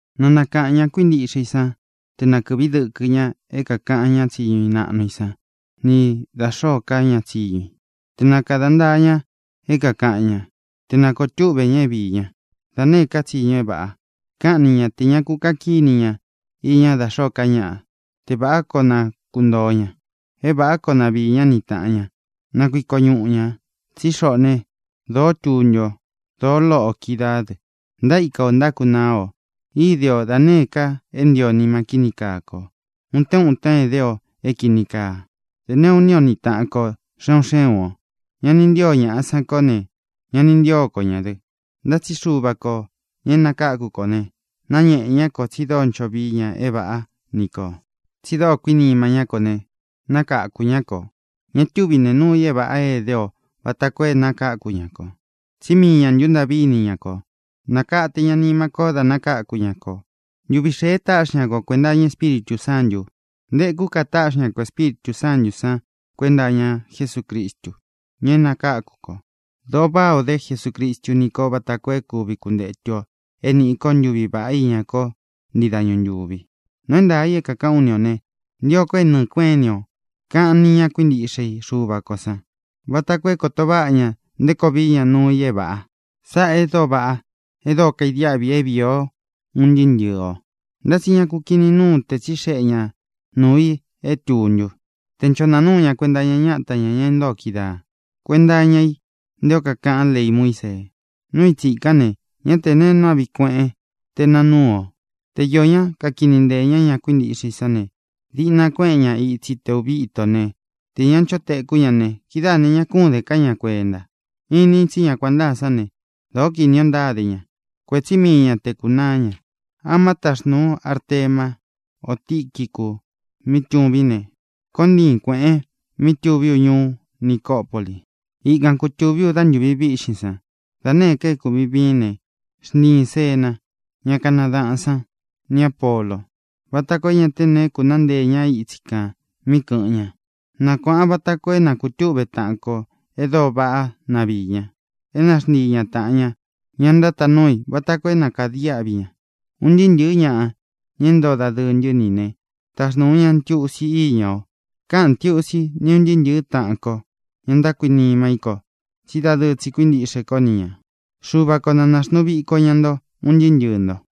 Na nākaꞌan ña kuíntiꞌxe i sán te na kɨ̄ꞌví dɨkɨ ña é kākaꞌan ñá tsiñu naꞌnu i san ni da xōó ka ña tsiñu i, te na kāda ntaa ña é kākaꞌan ñá, te na kōo túꞌve ña é viī ñá da nēé ka tsiñu é vāꞌa. Káꞌan ni ña tē ña ku kaꞌan kíni ña iña dá xōó ka ñaꞌa, te vāꞌá koo na kuntōo ña, é vāꞌá koo na viī ñá ni tāꞌan ña, na kuiko ñuꞌu ñā. Tsí xoꞌō né, dōó tuntu o, dōó loꞌo ō kídaā dɨ. Ntaíka ō ntákunaa o. Ide o da nēé ka é ntio nima kíni kaa kō. Utén uten edé o é kīni kaa. Dē néꞌu iní o ni taꞌan kō xé un xé un ō. Ña ni ntío ñaꞌa san kó ne, ña ni ntío ko ñā dɨ. Ntá tsi Xuva kō, ña é nakáku kō ne, náñēꞌe ñá kō tsi dóo ncho vií ña é vāꞌá ni kō, tsi dóo kuinima ñá kō ne, nákakū ñá kō. Ña túvi nēe nuu i é vāꞌa é ēdé o vata koo é nakakū ñá kō, tsí mii ñā ntúntaꞌví ini ña kō. Nākate ña nima kó da nakáku ña kō. Ntuvi xēe táꞌxi ña ko kuenta iña Espíritū Sántū. Ntekú ka táꞌxi ña kō Espíritū Sántū san kuenta iña Jesúcristu, ña é nakáku kō. Dōo váꞌā o dé Jesucristu ni kó vata koo é kuvi kuntetu ō é nīꞌi ko ntuví vaꞌá iña ko ntii dañu ntúvi. Nuu é ntaā i é kākaꞌán u ni ō ne, ntio ko é nɨ̄ɨ kuéꞌen ini o kāꞌan ni ña kuíntiꞌxe i Xuva kō sán vata koo é kōto váꞌa ña nté koo vií ña nuu i é vāꞌa. Sáꞌā e dóo vaꞌá, e dóo kaidiáꞌvi i é vīi o un ntɨɨ́ ntɨ̄ɨ o. Ntá tsi ña ku kinin núun te tsixeꞌe ñāꞌa nuu i é tūntu, te ncho nāa núu ña kuenta iña ñáta ñā, ña intóo kídaa, kuēnta iña i nté o kakaꞌán lei Muísee. Núu i tsīkán ne, ñá tē neé nuu áꞌvi kueꞌén te nāa núu ō. Te īó ñaꞌa kakini nteē ñá ña kuíntiꞌxe i sán ne, diꞌna kuéꞌen ña itsi te ūvi íto ne, tē ñá ncho tēkú ña ne, kidáā ne, ña kún den ká ña kuenta. Inin tsí ña kuan ntáa sán ne, dōó kinī o ntáde ña. Kuétsi mii ña te kūnaá ña. Ama táxnūu ú Artemá ō Tiquicu mí tūvín ne, koon ntiin kuēꞌen mí tūví u ñuú Nicopoli. Ikan kutūví u dá ntūvi víꞌxin san. Da nēé ka é kūvin viín ne, xntiīn Zena, ñá kanadaꞌān sán, ni Āpolo, vata koo é ñā té neé kūnaá nteē ñá itsi kān mí kɨ̄ꞌɨn ña. Nakuāꞌan vata koo é na kūtúꞌve taꞌan kō e dóo vaꞌá na viī ña, é na xntii ña tāꞌan ña, ña ntátaan núu i, vata koo é na kādiáꞌvi ña. Un ntɨɨ́ ntɨ̄ɨ́ ñaꞌa, ña é ntoo dadɨɨ ntɨ́ ni ī né, taxnūu ña ntiusi íña o. Káꞌān ntiusi ni ún ntɨɨ́ ntɨ̄ɨ́ taꞌan ko, ña ntákuinima í ko tsí dadɨɨ tsi kuíntiꞌxe kó ni ñā. Xuva ko na nāxnuu viko ña nto un ntɨɨ́ ntɨɨ̄ nto.